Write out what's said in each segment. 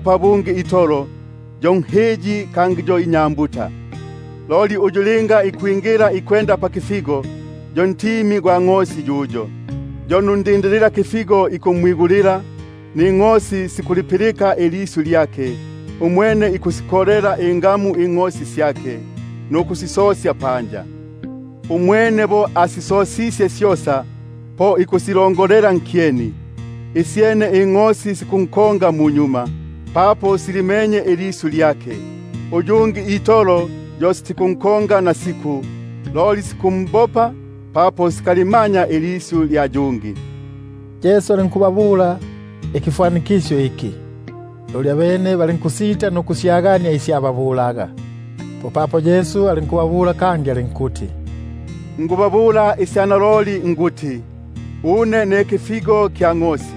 pabungi itolo, yo nhiyi kangi inyambuta. Loli uyu linga ikwenda pakifigo, yo ntimi gwa ngʼosi yuyo. Yo nundindililakifigo ikumwigulila, ningʼosi sikulipilika ilisyu lyake; umwene ikusikolela ingamu ingʼosi syake, nukusisosya panja. Umwene bo asisosisye syosa, po ikusilongolela nkyeni; isyene ingʼosi sikunkonga munyuma, papo silimenye ilisyu lyake. Uyungi itolo yo sitikunkonga nasiku, loli sikumbopa; papo sikalimanya ilisyu lya bangi. Yesu alinkubabula ikifwanikisyo iki, loli abene balinkusita nukusyagania isi ababulaga. Popapo Yesu alinkubabula kangi alinkuti: Naloliloli niku- babula une nikuti, une ne kifigo kya ngʼosi.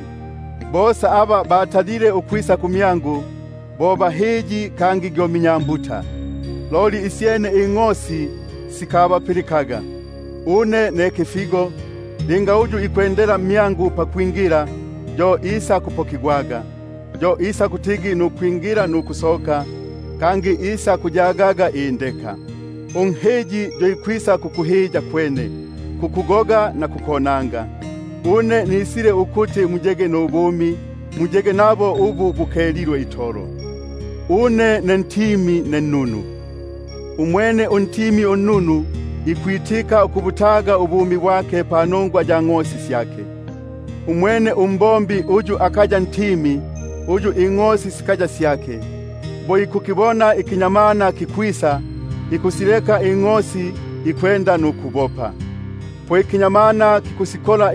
Bosa aba batalile ukwisa kumyangu, bo hahiyi kangi minyambuta; loli isyene ingʼosi sikabapilikaga. Une ne kifigo, linga yumo ikwendela mmyangu pakwingila, yo isakuponaga; yo isakutigi nukwi- ngila nukusoka, kangi isakuyagaga nindeka. Unhiyi yo ikwisa itolo nkuhiya, nkugoga na nkonanga; une nisile ukuti bayege nubumi, bayege nabo ubu bukelilwe itolo. Une ne ntimi unnunu. Umwene untimi unnunu ikubutaga ubumi bwake panongwa ya ngʼosi syake. Umwene umbombi, uyu akaya ntimi, uyu ningʼosi sikaya syake, bo ikumbona kamutu#kamutu, bamo bikuti imbumbi. ikwisa, ikusileka ingʼosi ikubopa — popapo kamutu ikusikola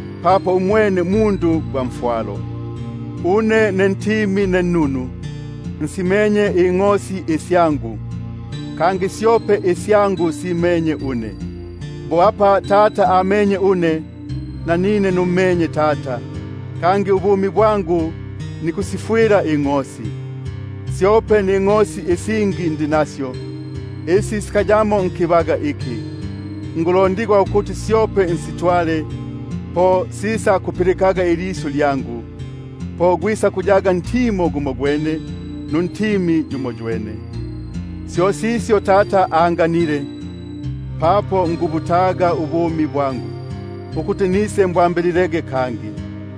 atikusibikilako umoyo ingʼosi. Une ne ntimi unnunu, nsime- nye isyangu, kangi syope isyangu simenye une. Bo apa Tata amenye une, nanine nummenye Tata; kangi ubumi bwangu nikusifwila ingʼosi. Syope ningʼosi isingi ndi nasyo, isi sikaya sya nkibaga kikiki. Syope fikuti nsitwale, po sisakupilikaga ilisyu lyangu; po gwisakuyaga ntimo gumogwene, nuntimi yumoywene. Syo sisyo Tata anganile, papo nikubutaga ubumi bwangu, ukuti nisembwambililege kangi.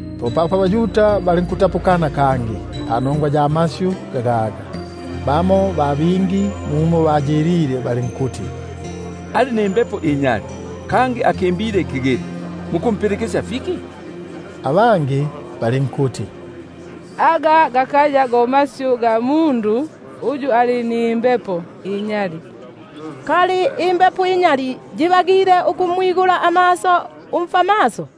Popapo abaYuda balinkutapukana kangi, panongwa ya masyu gagaga. Bingi mmyabo balinkuti: Ali nimbepo inyali, kangi akimbile ikigili; mukumpilikisya fiki? Abangi bali- nkuti: Aga gakaya go masyu ga mundu uyu ali nimbepo inyali; kali imbepo inyali yibagile ukumwigula amaso umfwamaso?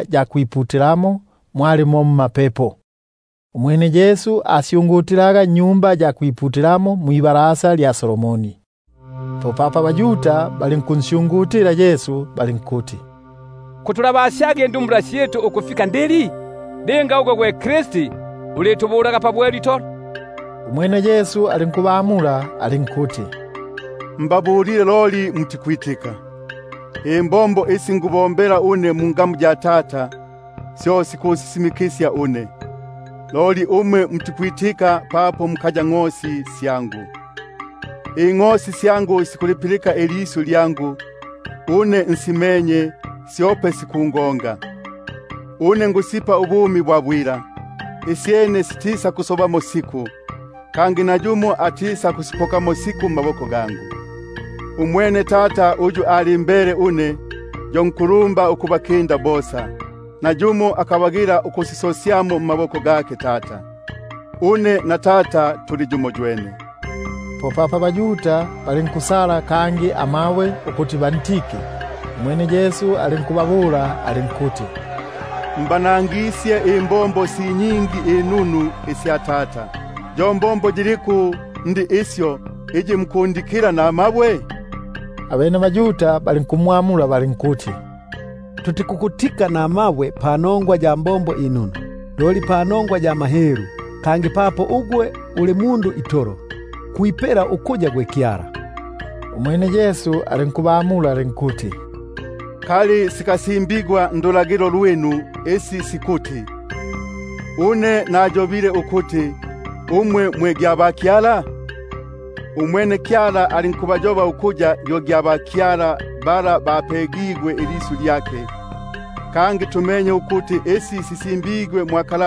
salemu; mwali mo mmapepo. Umwene Yesu asyungutilaga mwa Tempeli, mwibalasa lya Solomoni. Popapo abaYuda balinkumbumbanila Yesu balinkuti: Kutulabasyaga indumbula syitu ukufika ndili? Linga gwe Kristi, ulitubulaga pabwelu itolo. Umwene Yesu alinkubamula alinkuti: Nababulile, loli mutikwitika; imbombo isi nikubombela mungamu ya Tata, syo sikusisimikisya une. Loli umwe mutikwitika, papo mukaya ngʼosi sya pantimo gwangu. Ingʼosi syangu sikulipilika ilisyu lyangu; une nsimenye, syope sikungonga. Une nikusipa ubumi bwa bwila, isyene sitisakuyongamo siku, kangi nayumo atisakusipokamo siku mmaboko gangu. Umwene Tata uyu alimbele une, yo nkulumba ukubakinda bosa; nayumo akabagila ukubapokamo nkiboko kya Tata. Une na Tata tuli yumoywene. Popapo abaYuda balinkusala kangi amabwe ukuti bantike. Umwene Yesu alinkubamula alinkuti: Imbombo nyingi inunu isya Tata mbanangisye; yo mbombo yiliku iyi mukundikila namabwe? Abene abaYuda balinkumwamula balinkuti: Tutikukutika panongwa ya mbombo inunu: loli panongwa ya mahelu, kangi papo ugwe gwe uli mundu itolo, kwipela ukuya gwe Kyala. Umwene Yesu alinkubamula alinkuti: Ngimba sikasimbigwa ndulagilo lwinu isi sikuti: Une nayobile ukuti, umwe mwe bakyala? Apene linga abayobile ukuya bo bakyala, aba lyabisile ilisyu lya Kyala, (kangi isi sisimbigwe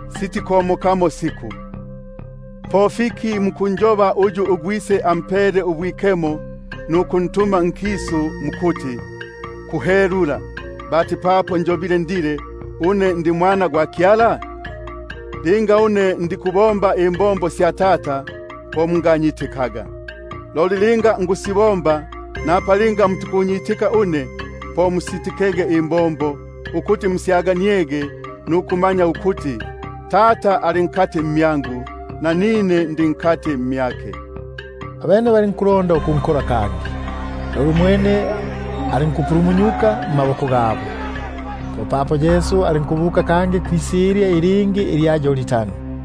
sitikomokamo siku), po fiki mukunjoba uyu uGwise ampele ubwikemo nukuntuma nkisu, mukuti: Kuhelula; papo njobile ukuti, une ndi Mwana gwa Kyala? Linga une ndiku- sibomba imbombo sya Tata, po munganyitikaga. Loli linga nikusibomba, napa linga mutikunyitika une, po musitikege imbombo, ukuti musyaganiege nukumanya ukuti, Tata ali mmyangu, nanine ndi mu mwa Tata. Abene balinkulonda ukunkola kangi, loli alinkupona mmaboko gabo. Popapo alinkubuka kangi kwisilya ilingi ilya Yordani,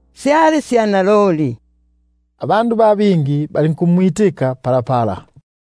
syali sya naloli. Ba bingi balinkumwitika palapala.